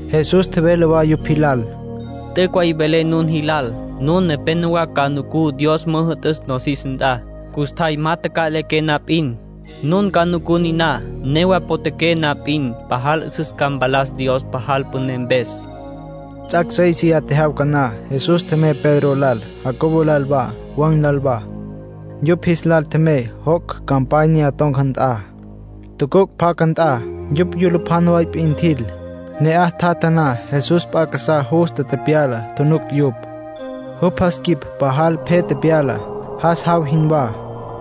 Jesús tjevele wa yupj jilal: —T'üc' way velé nun jilal. Nun nepénowa ca nucú Dios ca müjü'tüs nosis nt'a. Custjay ma taca'liqué na p'in, nun ca nucú niná. Newa potjaqué na p'in, pajal 'üsüs ca mpalas Dios pajal püné mpes. Ts'ac' séisiya tjejyawca na, Jesús tjemey Pedro lal, Jacobo lal wa, Juan lal wa. Yupj jis lal tjemey joc' campanya ton̈ca nt'a, tucuc' pacá nt'a. Yupj yulupjana way p'in tjil. Ne'aj tjatja na, Jesús p'a casá justa tepyala tjunuc yupj. Jupj jas quip pajal pje tepyala, jas jaw jinwá.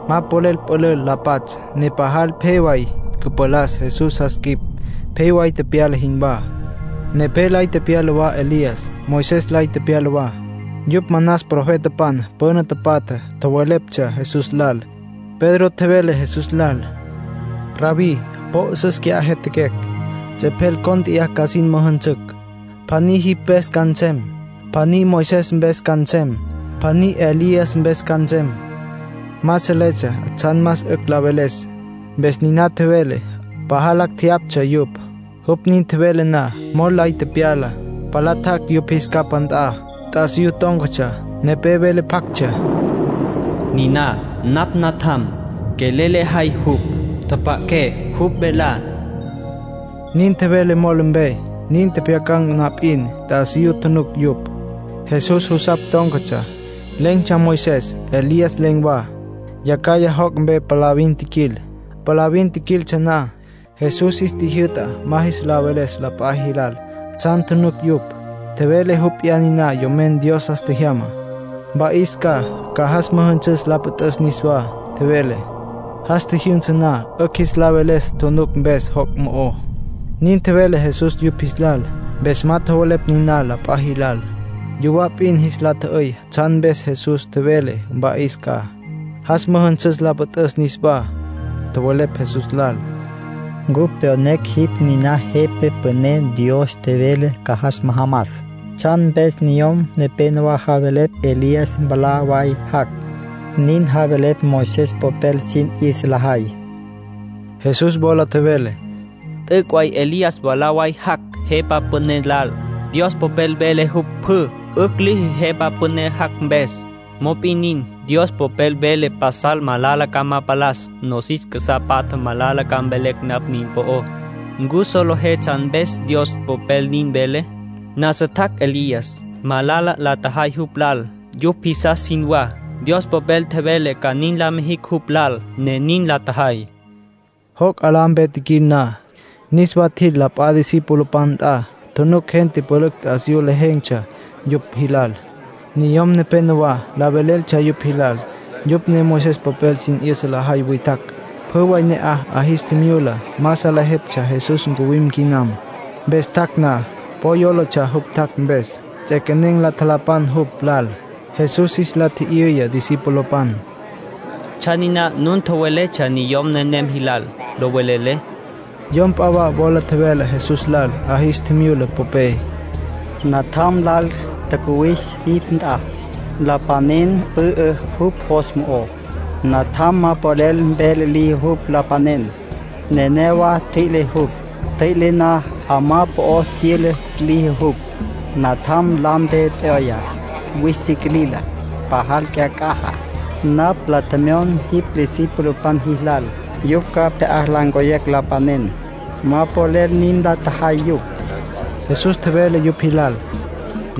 Ma polel pülül la patsj ne pajal pje way cüpalas Jesús jas quip pje way tepyala jinwá. Nepé lay tepyala wa Elías. Moisés lay tepyala wa. Yupj manas profetapan püna tapatjá. Tjoweleptsja Jesús lal. Pedro tjevele Jesús lal: —Rabbí, po 'üsüs qui'á jyatjaquecj. Ts'epjel cónt'eya ca sin müjünsücj. Pjaní jipj mpes ca nsem, pjaní Moisés mpes ca nsem, pjaní Elías mpes ca nsem. Ma seletsja tsjan más 'ücj la veles, mpes niná tjevele. Pajal lacj jeyaptsja yupj. Jupj nin tjevele na, mol lay tepyala, palá tjac' yupj jis capá nt'a. T'asiyú tón̈catsja. Nepé vele pjactsja: “Niná napj Natjam. Quelel lejay jupj. Tjapja'aqué jupj velá”, nin tjevele mol mpe. Nin tjepjyacan̈ na p'in, t'asiyú tjunuc yupj. Jesús jusapj tón̈catsja. Len̈tsja Moisés, Elías len̈ wa. Yacjaya joc' mpe palavin tjiquil. Palavin jiquiltsja na, Jesús jis tjijyü'ta ma jis la veles la p'a jilal tsjan tjunuc yupj. Tjevele jupj p'iyá niná Yomen Dios jas tjejyamá. Mpa'is ca, ca jas müjünsüs la püt'üs niswá, tjevele. Jas tjijyünsa na, 'ücj jis la veles tjunuc mpes joc' mo'ó; nin tjevele Jesús yupj jis lal. Mpes ma tjowelepj niná la p'a jilal. Yuwá p'in jis la tjü'üy tsjan mpes Jesús tjevele mpa'is ca, jas müjünsüs la püt'üs niswá. Tjowelepj Jesús lal: —Cupj pyonecj jipj niná Jepa Püné Dios tjevele ca jas majamas. ¿Tsjan mpes niyom nepénowa javelepj Elías mwalá way jac'? Nin javelepj Moisés popel sin 'yüsa lajay. Jesús wola tjevele: —T'üc' way Elías mwalá way jac' Jepa Püné lal. Dios Popel vele jupj pjü 'ücj liji Jepa Püné jac' mpes. Mop'in nin, Dios Popel vele pasal malala ca ma palas. Nosis casá patja malala ca mvelecj napj nin po'ó. ¿Ncu solejé tsjan mpes Dios Popel nin vele? Nasa tjac' Elías. Malala la tjajay jupj lal, yupj jisastsja jinwá. Dios Popel tjevele ca nin la mijicj jupj lal, ne nin la tjajay —nin tjevele Jesús. Joc' 'alá mpe tjiquil na, niswa tjil la p'a discipulopan nt'a. Tjunuc gente pülücj t'asiyú lejen̈tsja yupj jilal. Niyom nepénowa la veleltsja yupj jilal. Yupj ne Moisés popel sin 'yüsa lajay witjacj. Pjü way ne'aj 'a jis tjimyula ma salejeptsja Jesús ncuwim quinam. Mpes tjac' na, po yólatsja jupj tjac' mpes. Ts'equenen̈ la tjalapan jupj lal. Jesús jis la tji'yüya discipulopan: —¿Tsjan niná nun tjoweletsja niyom nenem jilal, lo velelé? Yom p'a wa wola tjevele Jesús lal 'a jis tjimyula popé: —Natjam lal tjacuwis jipj nt'a. Lapanen pü'ü jupj jos mo'ó. Natjam ma polel vele liji jupj, lapanen. Nenéyawa tjüi'le jupj. Ntjüi'le na, 'amá po'o tyüla liji jupj. Natjam lampe p'yoya, wüis si quilila. Pajal cyac'aja. Napj la tjemyon jipj discipulopan jilal yupj ca pje'á la ncoyecj lapanen. Ma polel nin la tjajay yupj. Jesús tjevele yupj jilal: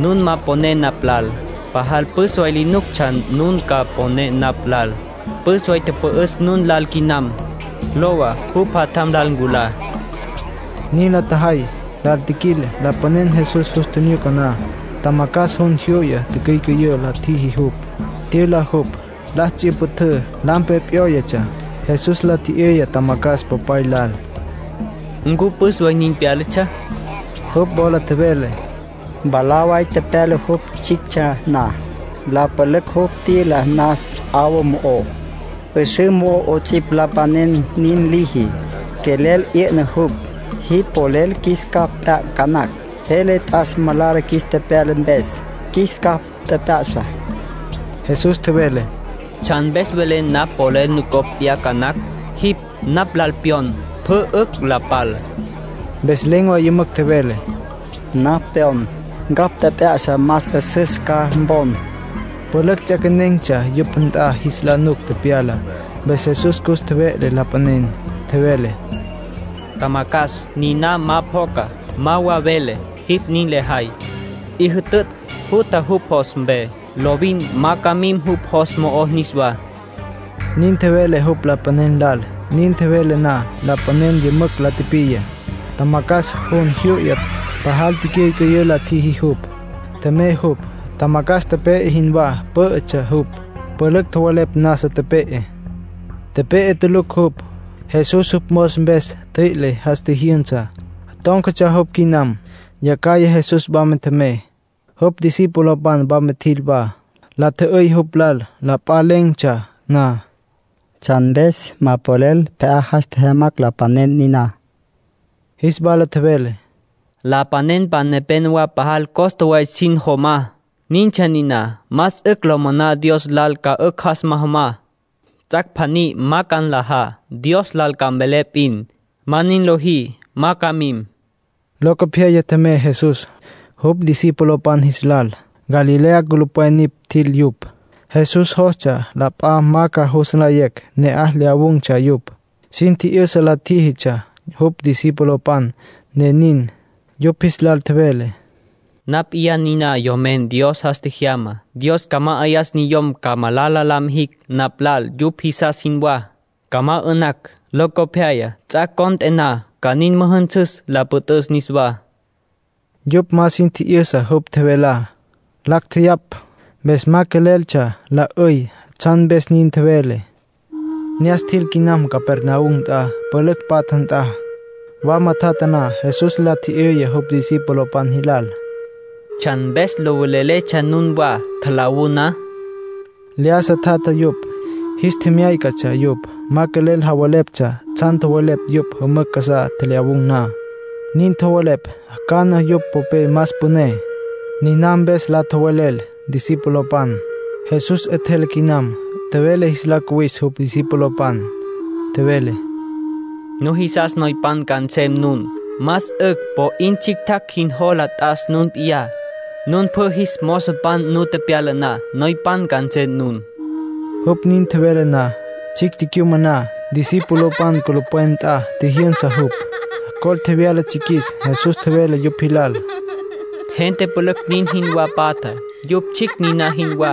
—Nun ma poné napj lal. Pajal püs way li nuctsja nun ca mponé napj lal. Püs way tüpü'üs nun lal quinam. Lowa, jupj jatjam lal nculá. Nin la tjajay, lal tjiquil. Lapanen Jesús jus tjinyuca na, tjamacjas jun jyu'ya, ticyücüyǘ la tjiji jupj. Tyüla jupj, la ts'yüpjütǘ. Lampe p'yóyatsja. Jesús la tji'yüya tjamacjas popay lal: —¿Ncu püs way nin pyálatsja? Jupj wola tjevele: —Mwalá way tepyala jupj tsjictsja na. La pülücj jupj tyüla nas 'awa mo'ó, 'üsǘ mo'ó 'ots'ipj, lapanen nin liji. Quelel 'yü'na jupj. Jipj polel qjuis capj p'yacj ca nacj. Jele t'as malala qjuis tepyala mpes. Qjuis capj tjep'ya'sa. Jesús tjevele: —¿Tsjan mpes velen napj polel nucopj p'yacj ca nacj? Jipj napj lal pyon, pjü 'ücj la pal. Mpes len̈ way yümücj tjevele: —Napj pyon. ¡Ncapj tjep'ya'sa, más 'üsüs ca mpon! Pülücj ts'equenen̈tsja yupj nt'a jis la nuc tepyalá. Mpes Jesús cus tjeve'le lapanen. Tjevele: —Tjamacjas niná ma pjoca, ma wa vele, jipj nin lejay. 'I jütütj, jutja jupj jos mpe. Lovin ma ca mim jupj jos mo'ó niswá —nin tjevele jupj lapanen lal. Nin tjevele na, lapanen yümücj la tipiya. Tjamacjas jun jyu'ya, pajal ticyücüyǘ la tjiji jupj. Tjemey jupj. Tjamacjas tepe'e jinwá pǘ'ütsja jupj. Pülücj tjowelepj nasa tepe'e. Tepe'e tulucj jupj. Jesús jupj mos mpes ntjüi'le, jas tjijyünsa. Tón̈catsja jupj quinam. Yacjaya Jesús wama tjemey. Jupj discipulopan wama tjil wa, la tjü'üy jupj lal la p'a len̈tsja na: —¿Tsjan mpes ma polel pje'á jas tjejyamacj lapanen niná? Jis wala tjevele: —Lapanenpan nepenowá pajal costa way sin jomá. Nintsja niná. Más 'ücj lo moná Dios lal ca 'ücj jas majamá; ts'ac' pjaní ma ca nlajá, Dios lal ca mvelé p'in. Ma nin lojí, ma ca mim —nin tjevele Jesús. Locopyaya tjemey Jesús, jupj discipulopan jis lal. Galilea culupwen nipj tjil yupj. Jesús jostsja la p'a ma ca jus nlayecj ne'aj lyawun̈tsja yupj. Sin tji'yüsa la tjíjitsja jupj discipulopan, ne nin. Yupj jis lal tjevele: “Napj p'iyá niná Yomen Dios jas tjejyamá. Dios ca ma'ayas niyom ca malala la mijicj napj lal yupj jisas jinwá. Ca ma 'ü'nacj; locopyaya, ts'ac' cont'e na ca nin müjünsüs la püt'üs niswá”, nin tjevele jupj. Yupj ma sin tji'yüsa jupj tjevelá. Lacj tjeyapj, mpes ma queleltsja la 'üy tsjan mpes nin tjevele. Ne'as tjil quinam Capernaum nt'a, pülücj patja nt'a. Wama tjatja na Jesús la tji'yüya jupj discipulopan jilal: —¿Tsjan mpes lo veleletsja nunwa tjalawú na? Lyájasa tjatja yupj. Jis tjemyácatsja yupj. Ma quelel javeleptsja tsjan tjowelepj yupj jümücj casá tjelyawun̈ na. Nin tjowelepj cana yupj popé más püné. Niná mpes la tjowelel discipulopan. Jesús 'etjele quinam. Tjevele jis la cuwis jupj discipulopan. Tjevele: —Nujisas noypan ca nsem nun, más 'ücj po 'in tsjictjacj jin nujola t'as nun p'iyá. Nun pjü jis mozopan nu tepyala na, noypan ca nsem nun. Jupj nin tjevele na, tsjicj tecyumaná, discipulopan culupwen nt'a tjijyünsa jupj. Col tjevyala tsjiquis. Jesús tjevele yupj jilal: —Gente pülücj nin jinwá patja, yupj tsjicj niná jinwá.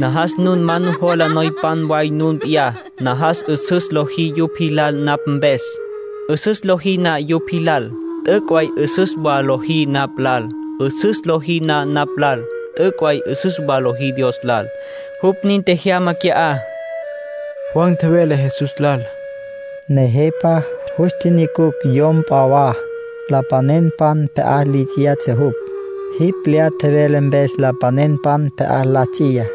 Najas nun ma nujola noypan way nun p'iyá. Najas 'üsüs lojí yupj jilal napj mpes. 'Üsüs lojí na yupj jilal, t'üc' way 'üsüs wa lojí napj lal. 'Üsüs lojí na napj lal, t'üc' way 'üsüs wa lojí Dios lal; jupj nin tjejyama qui'á. Juan tjevele Jesús lal: —Nejepa, jus tjinyucucj yom p'a wa lapanenpan pje'á li ts'iyatsja jupj. Jipj lyá tjevele mpes lapanenpan pje'á la ts'iya.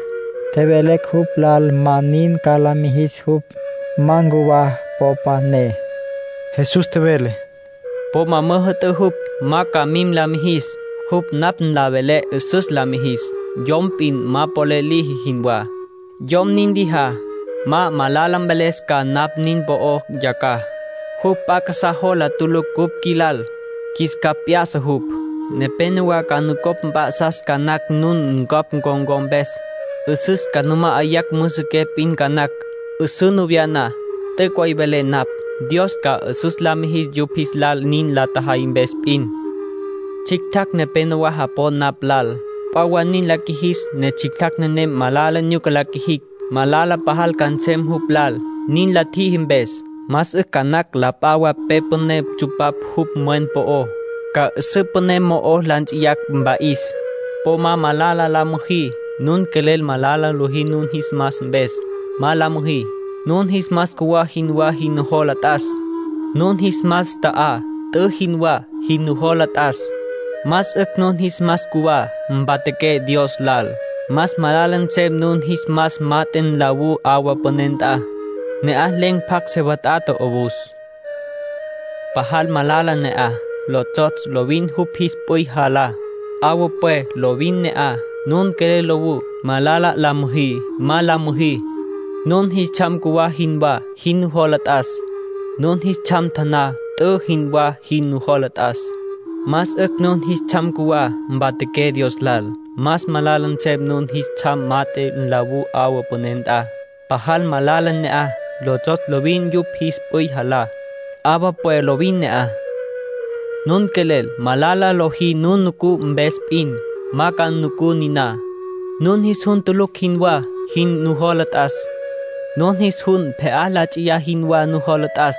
Tjevelecj jupj lal ma nin ca la mijis jupj, ma ncuwa popa ne. Jesús tjevele: —Po ma müjü'tǘ jupj ma ca nin la mijis. Jupj napj nlá vele 'üsüs la mijis, yom p'in ma polel liji jinwá. Yom nin lijá, ma malala mveles ca napj nin po'ó yacjaya. Jupj p'a casá jola tulucj cupj qjuilal, qjuis capj p'ya'sa jupj. Nepénowa ca nucopj mp'a'sacj ca nacj nun ncapj con̈có mpes. 'Üsǘ ca nu ma'ayacj müsiqué p'in ca nacj, 'üsǘ nu vya na. T'üc' way velé napj, Dios ca 'üsüs la mijis yupj jis lal nin la tjajay mpes p'in. ”Tsjictjacj nepénowa japon napj lal. P'a wa nin la qjuijis ne tsjictjacj nenem malala nyuca la qjuijicj, malala pajal ca nsem jupj lal, nin la tjiji mpes. Más 'ücj nactsja la p'a wa pe püné ntsu'pacj jupj mwen po'ó, ca 'üsǘ püné mo'o la nts'iyacj, mpa'is. ”Po ma malala la müjí. Nun quelel malala lojí nun jis mas mpes, ma la müjí. Nun jis mas cjuwá jinwá jin nujola t'as. Nun jis mas taná t'ü jinwá jin nujola t'as. Más 'ücj nun jis mas cjuwá, mpatjaqué Dios lal. Más malala nsem nun jis mas mat'e nlawú 'awa püné nt'a. Ne'aj len̈ pjacj se wat'ata 'owus. ‘Pajal malala ne'aj. Lotsjotsj lovin yupj jis p'üy jalá. 'Awa pwe lovin ne'aj.’ ”Nun quelel lowú, malala la müjí, ma la müjí. Nun jis tsjam cjuwá jinwá jin nujola t'as. Nun jis tsjam taná t'ü jinwá jin nujola t'as. Más 'ücj nun jis tsjam cjuwá, mpatjaqué Dios lal. Más malala nsem nun jis tsjam mat'e nlawú 'awa püné nt'a. ‘Pajal malala ne'aj. Lotsjotsj lovin yupj jis p'üy jalá. 'Awa pwe lovin ne'aj.’ ”Nun quelel malala lojí nun nucú mpes p'in, ma ca nucú niná. Nun jis jun tulucj jinwá jin nujola t'as. Nun jis jun pje'á la ts'i jinwá nujola t'as.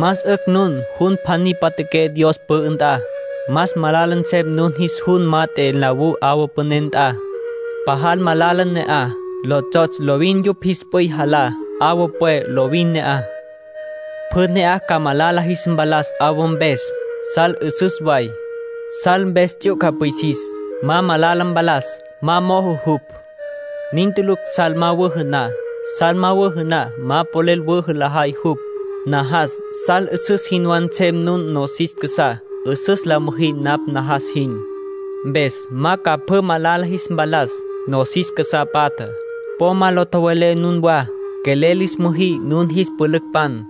Más 'ücj nun jun pjaní mpatjaqué Dios pü'ü nt'a. Más malala nsem nun jis jun mat'e nlawú 'awa püné nt'a. ‘Pajal malala ne'aj. Lotsjotsj lovin yupj jis p'üy jalá. 'Awa pwe lovin ne'aj.’ Pjü ne'aj ca malala jis mpalas 'awa mpes. ”Sal 'üsüs way. (Sal mpes ts'yuca pwisis, ma malala mpalas, ma mojo jupj.) Nin tulucj sal ma wüjü na. Sal ma wüjü na, ma polel wüjü lajay jupj. Najas sal 'üsüs jinwá nsem nun nosis casá. 'Üsüs ca la müjí napj najas jin. Mpes ma ca pjü malala jis mpalas nosis casá patja. Po ma la tjowe'lé nunwá. Quelel lis müjí nun jis pülücpan.